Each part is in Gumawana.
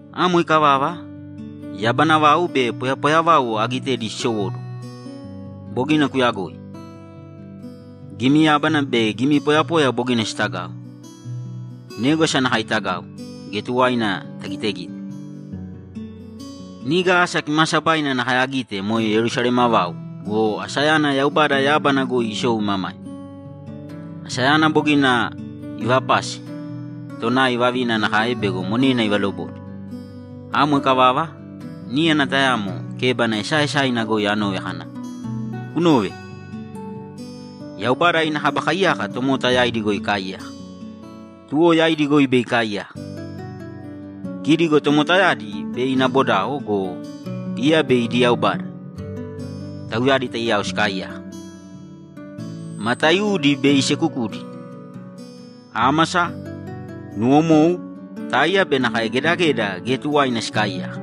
Amo ikavava, yabana vau be poyapoya vau agitedi sisowóduwo. Bogina kuyagoi. Gimi yábana be gimi poyapoya bogina sitagau. Négwasa nakae itagau, geya tuwaina tagitegite. Niga asa kimaasabaina nakae agite moe Yerusalema vau go, asayana Yaubada yábana goi isou imamaima. Asayana bogina ivapase tonai vavina nakae bego monena ivalobode. Amo ikavava, níyana tayamo kébana esaaesaina goi anove kana, ‘Kunōve! Yaubada ina Kaba Kaiyaka tomota yaidi goi ikaaiyaka. Tuwo yaidi goi bei ikaaiyaka. Kidi go tomotayadi bei ina bodao go, iya bei idi Yaubada; tauyadi taiyao sikaaiyaka. Mataiudi bei isekukudi. Ámasa, nuwomou, táiya be nakae gedageda geya tuwaina sikaaiyaka.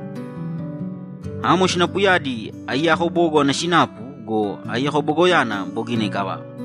Amo sinapuyadi aiyako bogo ana sinapu go, aiyako bogoyana bogina ikavava.’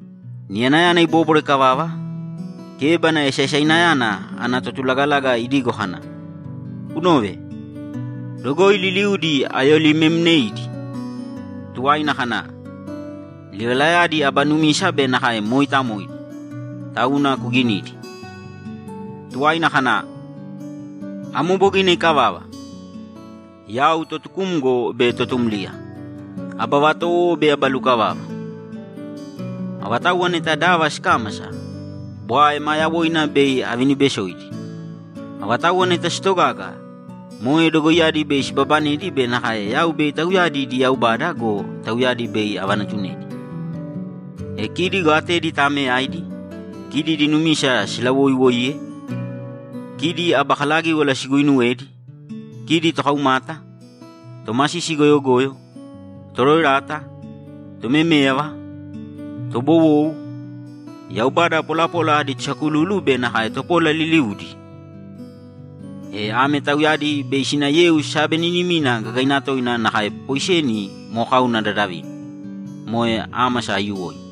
Niyanayana ibóbwara ikavava, kébana esaesainayana ana totulagalaga idigo kana, ‘Kunōve! Dogoi liliudi ayolimemmneidi.’ Tuwaina kana, ‘Livalayadi aba numisa be nakae mooitamoidi, tauna kuginīdi.’ Tuwaina kana, ‘Amo bogina ikavava! Yau Totukumgo be Totumliya, Aba Vatowo be Aba Lukavava. Avatauwa neta dava sikámasa, bwae ma yawoina bei avinibesoidi. Avatauwa neta sitogaga, moe dogoiyadi bei sibabanedi be nakae yau bei tauyadi idi Yaubada go, tauyadi bei avanatunedi. E kidi go atedi taameyaidi, kidi idi numisa silawoiwoiye, kidi aba kalagíwala siguuinuwedi, kidi tokaumata, tomasisi goyogoyo, toroerata, tomeméyava, tobowou, yaubada polapola adi tosakululu be nakae topola liliudi. E ame tauyadi bei sina yeu sabeninimina gagaina toina nakae poiseni mokauna dadavina, moe ámasa aiyuwoina.’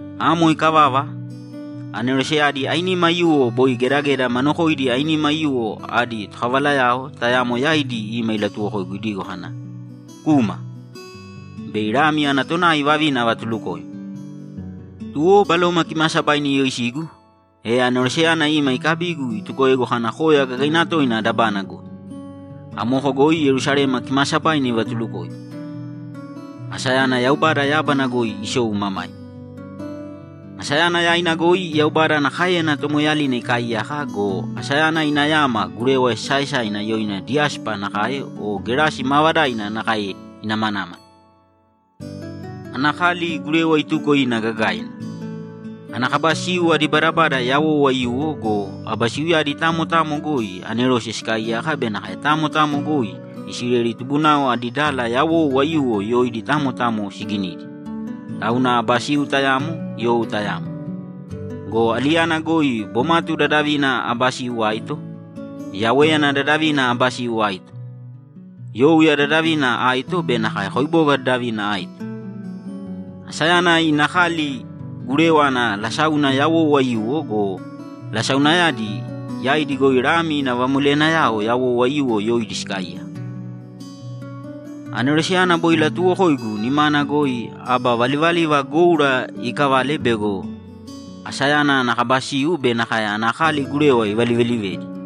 Amo ikavava, aneroseyadi ainima aiyuwo boi gedageda ma nokoidi ainima aiyuwo adi tokavalayao tayamo yaidi ima ilatuwokoigu idigo kana, ‘Kūma! Bei Lami ana tonai vavina avatulukoim.’ Tuwo Baloma Kimaasabaina iyoisigu, e aneroseyana ima ikabigu itukoegu kana koya gagaina toina dabana goi. Amoko goi Yerusalema kimaasabaina ivatulukoigu; asayana Yaubada yábana goi isou imamaima. Asayana yaina goi Yaubada ana káeyana tomoeeyalina ikaaiyaka go, asayana ina yama gurewa esaesa yoina diyáspa nakae o gerasi maavadaina nakae inamanámala. Ana kali gurewa ituko ina gagaina. Ana kaba siu adi badabada yawou aiyuwo go, aba siuyadi tamo tamo goi anerose sikaaiyaka be nakae tamo tamo goi Isileli tubunao adi dala yawou aiyuwo yoidi tamo tamo siginidi, tauna aba siu tayamo, you tayamo. Go aliyana goi bomatu dadavina aba siu aito, yawéyana dadavina aba siu aito, youya dadavina aito be nakae koiboga dadavina aito. Asayana ina kali gurewa ana lasáuna yawou aiyuwo go, lasaunayadi yaidi goi Lami ina vamoleyanayao yawou aiyuwo yoidi sikaaiyaka. Aneroseyana boi ilatuuwokoigu nimana goi aba valivaliva goura ikavale bego asayana ana kaba siu be nakae ana kali gurewa ivalivelivedi.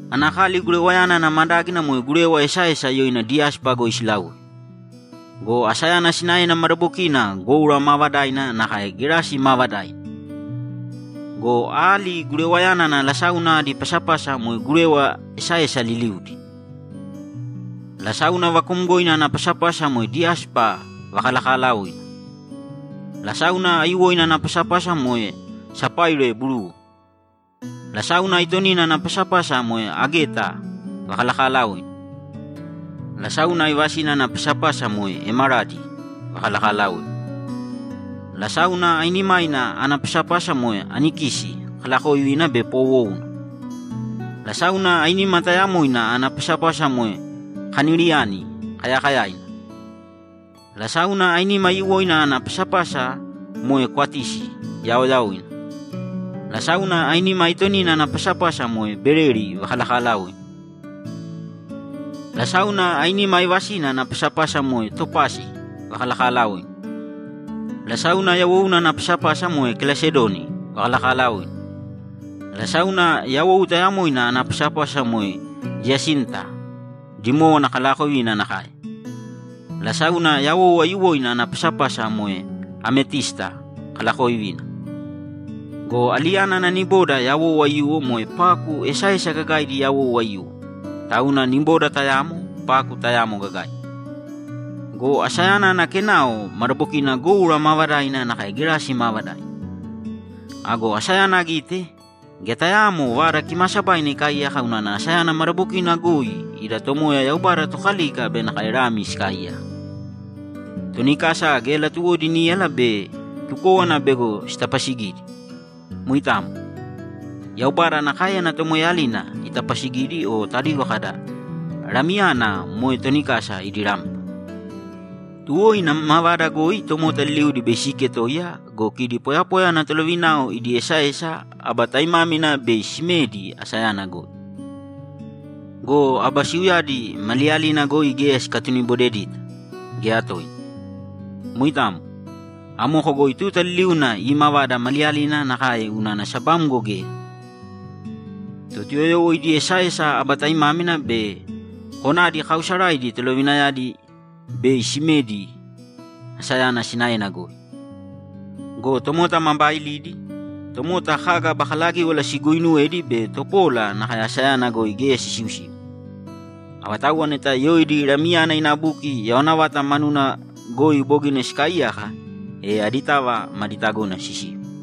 Ana kali gurewayana ana madágina moe gurewa esaesa yoina diyáspa goi silaui. Go asayana sinaena madabokina goura maavadaina nakae gerasi maavadaina. Go ali gurewayana ana lasáuna adi pasapasa moe gurewa esaesa liliudi. Lasáuna vakuumgoina ana pasapasa moe diyáspa vakalakalaoina. Lasáuna aiyuwoina ana pasapasa moe sapaire buruu. Lasáuna aitonina ana pasapasa moe ágeta vakalakalaoina. Lasáuna aivasina ana pasapasa moe emeradi vakalakalaoina. Lasáuna ainimaina ana pasapasa moe anikisi kalaakovina be poowouna. Lasáuna ainima tayamoina ana pasapasa moe kaniliani kayakayaina, Lasáuna ainima aiyuwoina ana pasapasa moe kwatisi yaoyaoina. Lasáuna ainima aitonina ana pasapasa moe beleli vakalakalaoina. Lasáuna ainima aivasina ana pasapasa moe topasi vakalakalaoina Lasáuna yawouna ana pasapasa moe kelasedoni vakalakalaoina Lasáuna yawou tayamoina ana pasapasa moe diyasinta dimówana kalaakovina nakae Lasáuna yawou aiyuwoina ana pasapasa moe ametísta kalaakovina. Go aliyana ana niboda yawou aiyuwo moe paku esaesa gagaidi yawou aiyuwo, tauna niboda tayamo, paku tayamo gagaina. Go asayana ana kenao madabokina goura maavadaina nakae gerasi maavadaina. Ago asayana agite, geya tayaamo Vada Kimaasabaina ikaaiyaka unana asayana madabokina goi Yauwe Yaubada Tokalika be nakae Lami sikaaiyaka. Toni kasa geya latuwodi níyala be tukówana bego sitapasigidi. Moitamo. Yaubada ana káeyana tomoeeyalina itapasigidi o tadigo kada, ‘Lamiyana moe toni kasa idi rampa.’ Tuwo ina mavada goi tomota liliudi bei siiketoiya go, kidi poyapoya ana tolovinao idi esaesa aba taimámina bei simedi asayana goi. Go aba siuyadi maliyalina goi geya sikatunibodedita, geya toina. Moitamo. Amoko goi tuta liliuna iimavada maliyalina nakae unana sabamgo geya. Totuyoyowo idi esaesa aba taimámina be konadi kaausaraidi tolovinayadi bei simedi asayana sinaena goi. Go tomota ma baailidi, tomota kaga aba kalagíwala siguuinuwedi be topola nakae asayana goi geya sisiusiu. Avatauwa neta yoidi Lamiyana ina buki yawana vata manuna goi bogina sikaaiyaka, e aditava madi tagona sisiu.